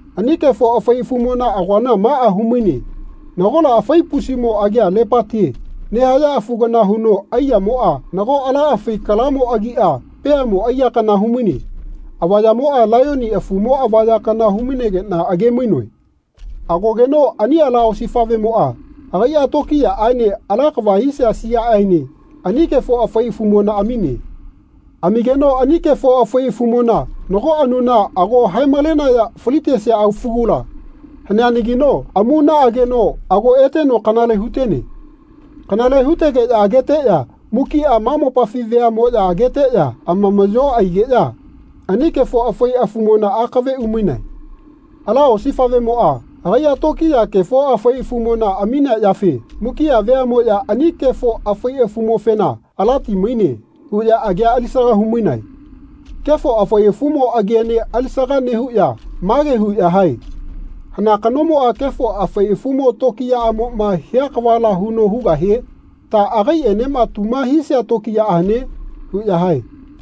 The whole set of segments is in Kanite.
Ani kefo afai afumona agoana maꞌa humaine. Nagola afai pusimo agia lepatie nehaya afu kana huno aiyamoꞌa nago ala afai kalamo agiꞌa peamo aiya kana humaine. Avayamoꞌa laiyoni afumo avaya kana hu-mainegeꞌna age-mainoe. Agogeno ani ala osifaꞌvemoꞌa agaiꞌa tokiyaꞌaene ala kava hisia siaꞌaene ani kefo afai afumona amine. Amigeno ani kefo afai afumona nago anuna ago hae-malenaya falitesea afugula haneanagi amuna ageno ago eteno kanale hutene. Kanale hutegeꞌya ageteꞌya mukiꞌa ma mopafi veaꞌmoꞌya ageteꞌya amamaꞌyo aigeꞌya ani kefo afai afumona akave umainae. Ala osifaꞌvemoꞌa agaiꞌa tokiya kefo afai afumona aminea yafe mukiꞌa veaꞌmoꞌya ani kefo afai afumofena “Alati maine.” huꞌya agia alisaga humainae. Kefo afai afumo agiene alisaga nehuꞌya mage huꞌya hae “Hana kanomoꞌa kefo afai afumo tokiyaꞌamoꞌma hia kavala huno hugahie? Ta agaiꞌenema tuma hisia tokiyaꞌa hane?” huꞌya hae.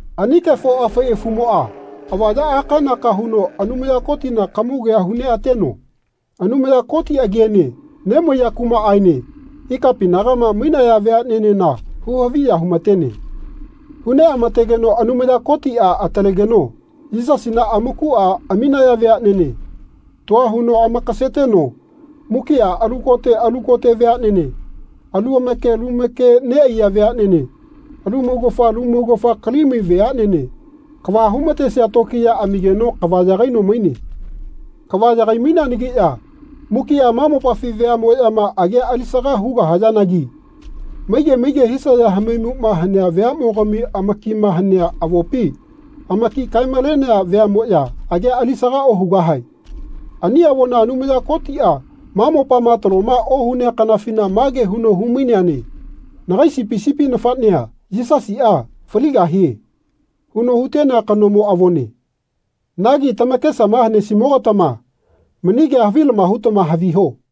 Ani kefo afai afumoꞌa avaya aka-naka huno Anumaya Kotina kamugea hu neꞌateno Anumaya Koti agiene nemaiya kumaꞌaene ikapinagama mainaya veaꞌaenena hu-haviya humatene. Hu neꞌamategeno Anumaya Kotiꞌa atalegeno Yisasina amakuꞌa aminaya veaꞌnene tua huno amakaseteno mukiꞌa alu kote alu kote veaꞌnene, alu make lu make neꞌaiya veaꞌnene, alu maugafa lu maugafa kalimai veaꞌnene, kava humatesia tokiya amigeno kava yagaino maine. Kava yagai-maineanagiꞌya mukiꞌa ma mopafi veaꞌmoꞌyama agia alisaga hugahayanagi maige maige hisaya hamaimuꞌma hanea veaꞌmogami amakima hanea avopi amaki kae-malenea veaꞌmoꞌya agia alisaga ohugahae. Ani avona Anumaya Kotiꞌa ma mopama taloma ohunea kanafina mage huno hu-maineane “Nagai Sipi sipi nafaꞌnea, Yisasiꞌa, faligahie.” huno hutenea kanomo avone. Nagi tamakesama hanesimo-gatama mani kea havilama hutama hiho.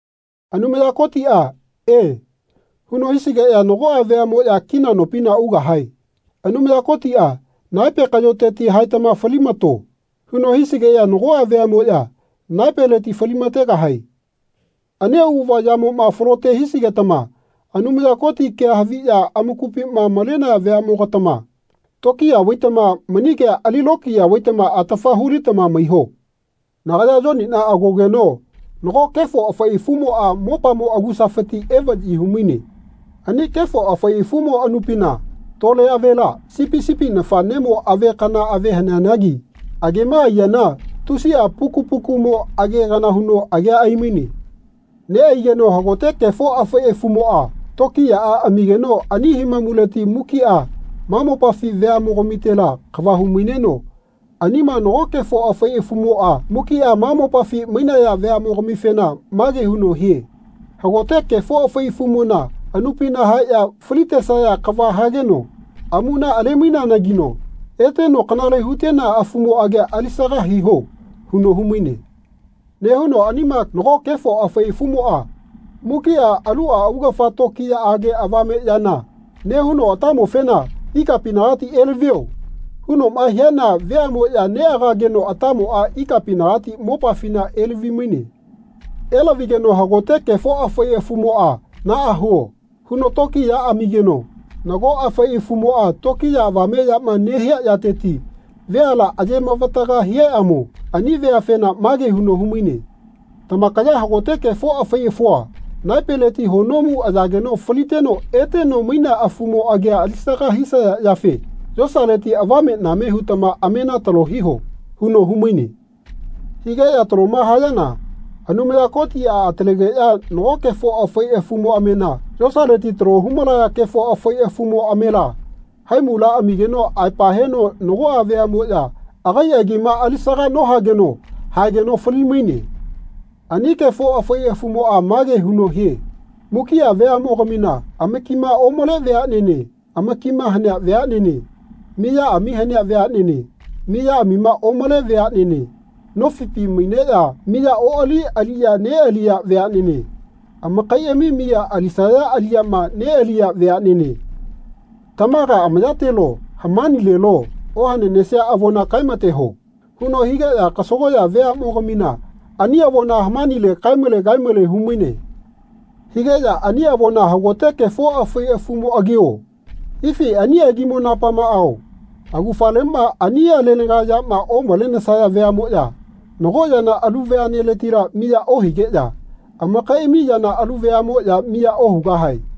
Anumaya Kotiꞌa “E.” huno hisigeꞌya nagoꞌa veaꞌmoꞌya kina nopina ugahae Anumaya Kotiꞌa “Naepe kaꞌyoteti haetama falimato.” huno hisigeꞌya nagoꞌa veaꞌmoꞌya naepeleti falilamategahae. Ani auꞌava yamoꞌma falote hisigetama Anumaya Koti kea haviꞌya amakupiꞌma malenaya veaꞌmogatama tokiya vaitama mani kea ali lokiya vaitama atafa hu-litama maiho. Nagaya Yoniꞌna agogeno nago kefo afai afumoꞌa mopamo agusafiti evaꞌyi humaine. Ani kefo afai afumo anupina tole avela, sipi sipi nafaꞌnemo ave kana ave haneanagi agema aiyana tusiꞌa puku pukumo age kana huno agea aimaine. Neꞌaigeno hagote kefo afai afumoꞌa tokiyaꞌa amigeno ani himamuleti mukiꞌa ma mopafi veaꞌmogamitela kava humaineno anima nago kefo afai afumoꞌa mukiꞌa ma mopafi mainaya veaꞌmogamifena mage huno hie “Hagote kefo afai afumona anupina haeꞌya falitesaya kava hageno amuna ale-maineanagino eteno kanale hutenea afumo agia alisaga hiho.” huno humaine. Nehuno anima nago kefo afai afumoꞌa mukiꞌa aluꞌa augafa tokiyaꞌage avame yana nehuno atamofena “Ikapinagati elavio.” hunoꞌma hiana veaꞌmoꞌya neꞌagageno atamoꞌa ikapinagati mopafina elavi-maine. Elavigeno hagote kefo afai afumoꞌa “Naꞌa huo.” huno tokiya amigeno nago afai afumoꞌa tokiya avame yama nehia yateti veala aye mavataga hiaꞌamo ani veafena mage huno humaine “Tamakaya hagote kefo afai afua, naepeleti honomu ayageno faliteno eteno mainea afumo agia alisaga hisaya yafe yosaleti avameꞌname hutama amena talo hiho.” huno humaine. Higeꞌya taloma hayana Anumaya Kotiꞌa atalegeꞌya nago kefo afai afumo amena yosaleti talo humalaya kefo afai afumo amela haimula amigeno aepa heno nagoꞌa veaꞌmoꞌya agai agima alisaga nohageno haegeꞌya fali-maine. Ani kefo afai afumoꞌa mage huno hie “Mukiꞌa veaꞌmogamina, amakima omale veaꞌnene, amakima hanea veaꞌnene, miyaꞌami hanea veaꞌnene, miyaꞌamima omale veaꞌnene, nofipi maineꞌya miya oꞌali aliꞌya neꞌaliya veaꞌnene, amakaiꞌami miya alisaya aliꞌyama neꞌaliya veaꞌnene tamaga amayatelo hamanilelo ohananesia avona kaemateho.” huno higeꞌya kasagoꞌya veaꞌmo-gamina ani avomoꞌa hamanileti kae-male kae-male humaine. Higeꞌya ani avona hagote kefo afai afumo agio ifi ani agimo napamao amaugafaleꞌma ani alegana yama omalenesaya veaꞌmoꞌya nago yana alu veaꞌneletila miya ohigeꞌya amakaiꞌami yana alu veaꞌmoꞌya miya ohugahae.